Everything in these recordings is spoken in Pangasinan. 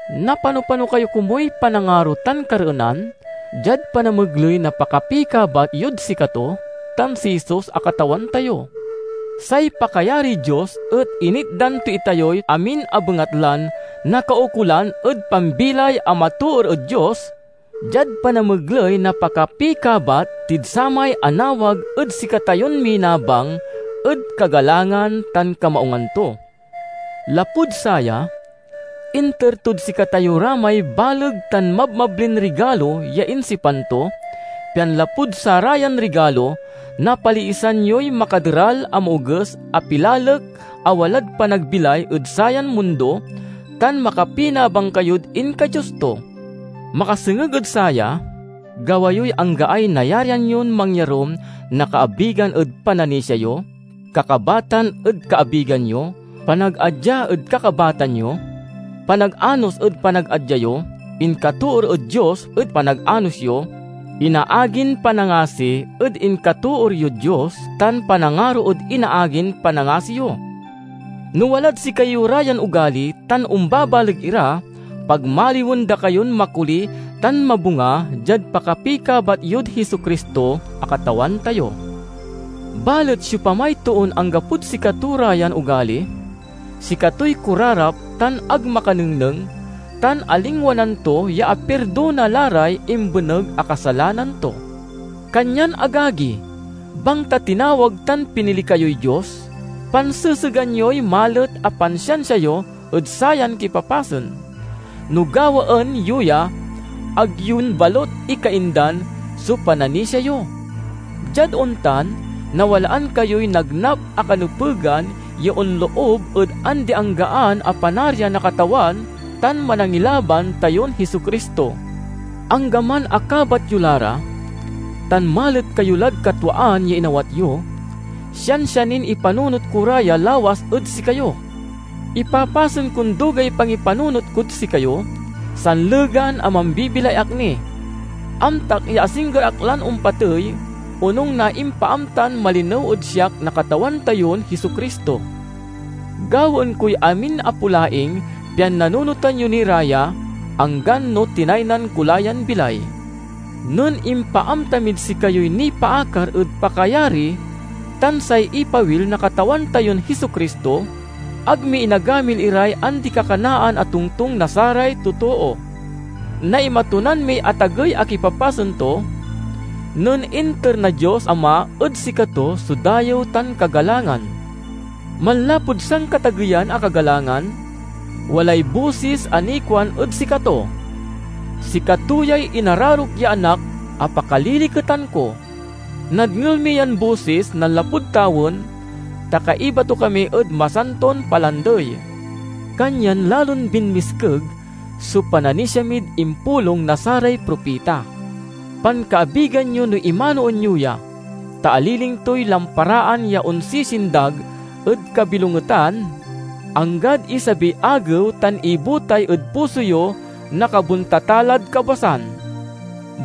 Napano-pano kayo komuy panangaro tan kareenan, diad panamegley na pakapikabat yod sikato tan si Jesus a Katawan tayo. Say pakayariy Dios et initdan to itayoy amin a bengatlan nakaukolan ed pambilay a matoor ed Dios, diad panamegley na pakapikabat tid samay anawag ed sikatayon minabang ed kagalangan tan kamaungan to. Lapud saya, inter tod sikatayo ra may baleg tan mabmablin rigalo ya insipan to, pian lapud sarayan rigalo, napaliisan yoy makaderal a maoges a pilalek a walad panagbilay ed sayan mundo, tan makapinabang kayod inka-Dios to. Makasengeg ed saya, gawa yoy anggaay nayarian yon mangyarum na kaabigan ed pananisia yo, kakabatan ed kaabigan yo, panagadya ed kakabatan yo, panaganos ed panagadya yo, inkatoor ed Dios ed panaganos yo, inaagin panangasi ed inkatoor yod Dios, tan panangaro ed inaagin panangasi yo. No walad sikayo ra yan ogali tan ombabaleg ira, pagmaliwen da kayon makoli tan mabunga diad pakapikabat yod Jesu-Cristo a Katawan tayo. Balet siopamay toon anggapod sikato ra yan ogali, sikatoy korarap tan ag makanengneng, tan alingwanan to ya apirdona la ray imbeneg a kasalanan to. Kanyan agagi, bangta tinawag tan pinili kayoy Dios, pansesegan yoy malet a pansiansia yo ed sayan kipapasen; no gawaen yo ya, ag yon balut ikaindan so pananisia yo. Diad ontan, nawalaan kayoy nagnap a kanepegan ya onloob ed andi-anggaan a Panarian na Katawan tan Manangilaban tayon Jesu-Cristo. Anggaman a kabat yo la ra, tan malet kayo lad katwaan ya inawat yo, siansia nin ipanunot ko ra ya lawas ed sikayo. Ipapasen kon dugay pangipanunot kod sikayo, sanlegan a mambibilay ak ni. Amtak ya asingger ak lan ompatey onung na impaamtan malinew ed siak na Katawan tayon Jesu-Cristo. Gawaen koy amin a polaing pian nanunotan yo ni ra ya, anggan no tinaynan ko la yan bilay. Nen impaamta mid sikayoy nipaakar ed pakayari tan say ipawil na Katawan tayon Jesu-Cristo, ag mi inagamil iray andi-kakanaan a tongtong na saray totoo. Naimatunan miy atagey a kipapasen to nen inter na Dios Ama ed sikato so dayew tan kagalangan. Manlapud Sankatageyan a Kagalangan, walay bosis a nikuan ed sikato, "Sikato yay inararok ya Anak a pakaliliketan ko!" Nadngel mi yan bosis nanlapud tawen, ta kaiba to kami ed masanton palandey. Kanyan lalon binmiskeg so pananisia mid impulong na saray propita. Pankaabigan yo no imanoen yo ya, ta aliling toy lamparaan ya onsisindag ed kabilongetan, anggad isabiy Agew tan ibutay ed puso yo na kabontatalad kabwasan.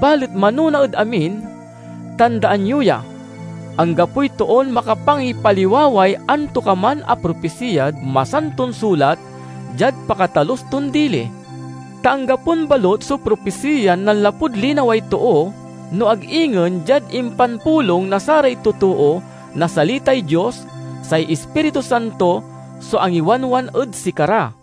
Balet manona ed amin, tandaan yo ya: anggapoy toon makapangipaliwaway antokaman a propisiyad Masanton Sulat diad pakatalus ton dili. Ta anggapon balut so propisiyan nanlapud linaway too, no ag ingen diad impanpulong na saray totoo na salitay Dios, say Ispiritu Santo so angiwanwan ed sikara.